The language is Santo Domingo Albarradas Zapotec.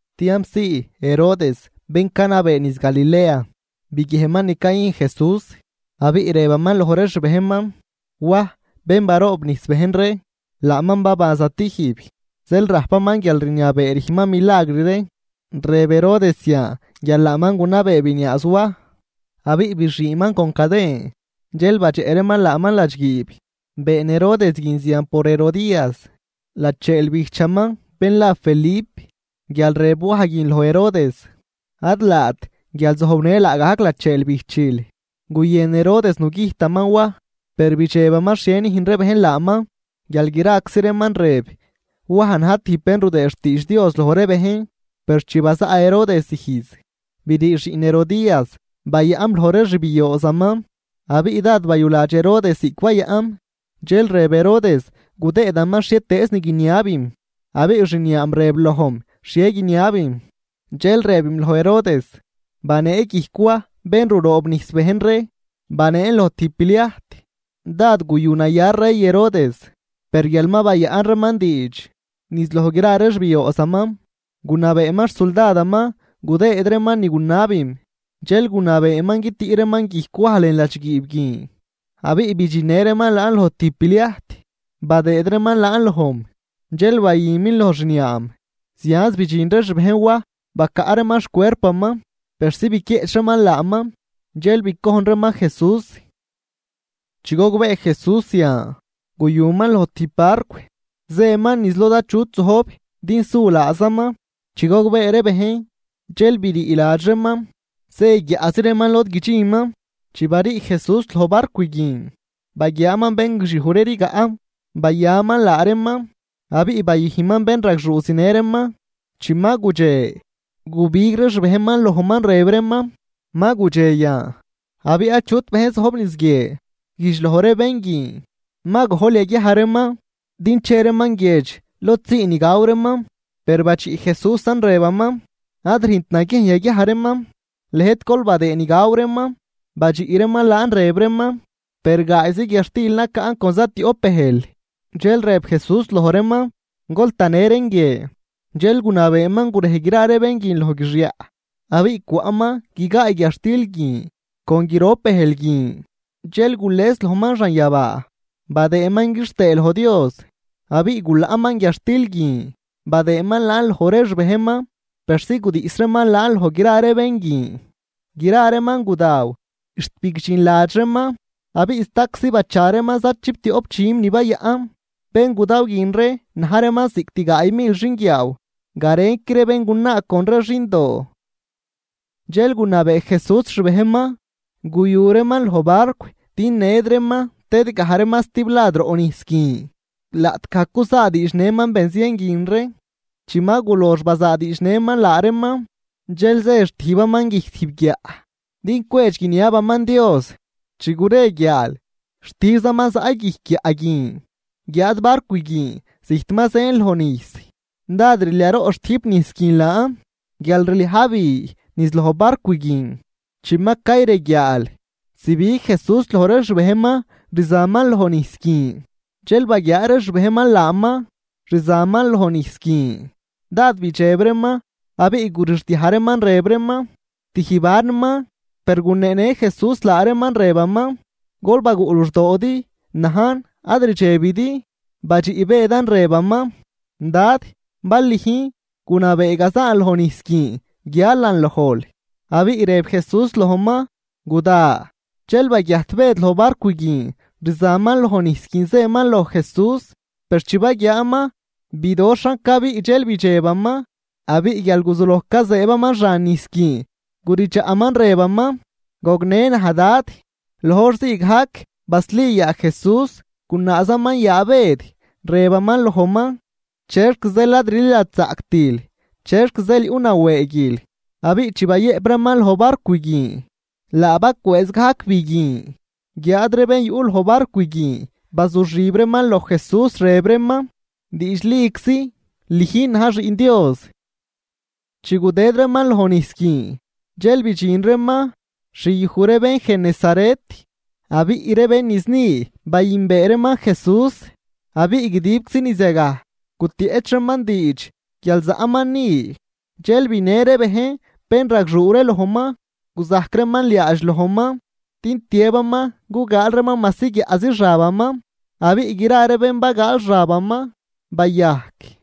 Tiampzii Herodes bén canabee niz Galilea, biguiejnman ni cayüjn Jesús. Abiꞌ rëbaman loj ree xbejnman: ―Waj bén baroobnijs bejn ree, laaman baban zatijb, zeel rajpaman guialrniabee rüjnman milagr ree. Rëb Herodes zian guial laaman gunabee biniaaz Waj, abiꞌ bixiiman con caden dxel badxeꞌ reeman laaman ladxguiib. Been Herodes guin zian por Herodías lacheel bijchaman bén la Felip, guial rëb Waj guin loj Herodes: ―Ad laat guial zojbnël laagajc lacheel bijchil. Guyën Herodes nugüjtaman Waj, per bidxebaman xhie nüjn ree bejn laaman guial graczi reeman rëb Waj na̱j tijb bén rudëëd xtiidx Dios loj ree bejn. Per chi bazaꞌ Herodes ijz, brii xiꞌn Herodías bayaꞌm loj ree xbioozaman. Abiꞌ dád bayuladx Herodes ziꞌc bayaꞌm, dxel rëb Herodes gudëëdaman xhietëëz ni guiniabim. Abiꞌ xniaam rëb lojm xhie guiniabim, dxel rëbim loj Herodes: ―Banee guijc Waj bén ruroobnijs bejn ree, baneen loj tijb pliajt. Dád guyunaya rey Herodes, per guial mal bayaꞌn reeman diidx niz loj gra ree xbioozaman, gunabeeman xsuldadaman gudëëd reeman ni gunabim. Dxel gunabeeman guitüꞌ reeman guijc Waj lën ladxguiib guin, abiꞌ bidxinnë reeman laan loj tijb pliajt badëëd reeman laan lojm, dxel bayümin loj xniaam. Zianz bidxin ree xbejn Waj bacaꞌ reeman xcuerpaman persi biquieꞌch reeman laaman. Dxel bicojn reeman Jesús. Chi gogbee Jesús zian, guyuman loj tijb barcw zëman niz lod achutczi zojb din su laazaman. Chi gogbee ree bejn, dxel brii ladx reeman zë guiaꞌzi reeman lod guidxinman. Chi barii Jesús loj barcw guin baguiaaman bén guixiuj ree rigaꞌ yagaj, bayaman laa reeman abiꞌ bayüjnman bénragxuu zinë reeman. Chi ma gudxe, gubig ree xbejnman lojman rëb reeman: ―Ma gudxe yan, abiꞌ achut bejn zojb niz guie. Güjdx loj ree bén guin ma gojl yaguiaj reeman, din che reeman guiedx lod sii ni gaw reeman. Per badxiꞌ Jesúsan rëbaman: ―Ad rüjnt naguiejn yaguiaj reeman, lëjt gol badëë ni gaw reeman. Badxiꞌ reeman laan rëb reeman: ―Per gaayzi guiadxtil nacaꞌn con zatioꞌp bëjl. Dxel rëb Jesús loj reeman: ―Gol tanë reen guie. Dxel gunabeeman gurej gra ree bén guin loj guixyaꞌ. Abiꞌ cwaꞌman guigaay guiadxtil guin con grop bëjl guin. Dxel gules lojman xanyabaa badëëman quixtëë loj Dios, abiꞌ gulaꞌman guiadxtil guin badëëman laan loj ree xbejnman persi gudiꞌs reeman laan loj gra ree bén guin. Gra reeman gudaw xt bigdxinladx reeman, abiꞌ staczi bacha reeman za chiptioꞌp dxüm ni bayaꞌn. Bén gudaw guin ree na̱j reeman cost gaay mil xinguiaaw garenqui ree béngunaa con ree xindoo. Dxel gunabee Jesús xbejnman guyu reeman loj barcw din ned reeman tëd gaj reeman stiblad roꞌ nijs guin, laꞌtgaj cuzaadiidx nëman benzien guin ree. Chi ma gulox bazaadiidx nëman laa reeman, dxel zë xtijbaman guijc tijb guiaꞌ din cwedx guiniabaman Dios. Chi gure guiaal xtijbzaman zaꞌ guijc guiaꞌ guin. Guiáad barcw guin zijt ma zën loj nijs, dád rliaroꞌ xtüjp nijs guin laan guial rliaj bi niz loj barcw guin. Chi ma cayreguiaal, zibig Jesús loj ree xbejnman rzaman loj nijs guin. Dxel baguiaa ree xbejnman laaman rzaman loj nijs guin, dád bidxeb reeman abiꞌ gurixdiaj reeman rëb reeman: ―¡Tijb anman! Per guneenë Jesús laa reeman rëbaman: ―¡Gol baguꞌ luxdoodi! ¡Najn, ad rdxebidi! Badxiꞌ Bëdan rëbaman: ―Dad, bal lüjn, gunabee gazan loj nijs guin guialan lojl. Abiꞌ rëb Jesús lojman: ―Guda. Dxel baguiajt Bëd loj barcw guin, rzaman loj nijs guin zëman loj Jesús. Per chi baguiaaman bidoxhan cabiꞌ dxel bidxebaman, abiꞌ guial guzuloj cazëëbaman xan nijs guin guridxaꞌman rëbaman: ―¡Gognë naj, Dad! Loj hor ziigajc basli yaa Jesús gunaazaman yaa Bëd, rëbaman lojman: ―¿Chexc zeel ad rliladxzaꞌctil, chexc zeel yuꞌ nawëëguil? Abiꞌ chi bayëꞌp reeman loj barcw guin, laa bacwëëz gajc bi guin. Guiáad ree bén yuꞌ loj barcw guin bazuxib reeman loj Jesús, rëb reeman: ―Diidxliczi lüjn na̱j xiꞌn Dios. Chi gudëd reeman loj nijs guin dxel bidxin reeman xyuj ree bén Genesaret. Abiꞌ ree bén niz ni bayünbee reeman Jesús, abiꞌ guidibczi niz yagaj gutieꞌch reeman diidx guial zaꞌman ni. Dxel binë ree bejn bénragxuu ree lojman, guzajc reeman liaadx lojman din tiëbaman gugaal reeman majsi guiaꞌzi xabaman. Abiꞌ gra ree bén bagaal xabaman bayajc.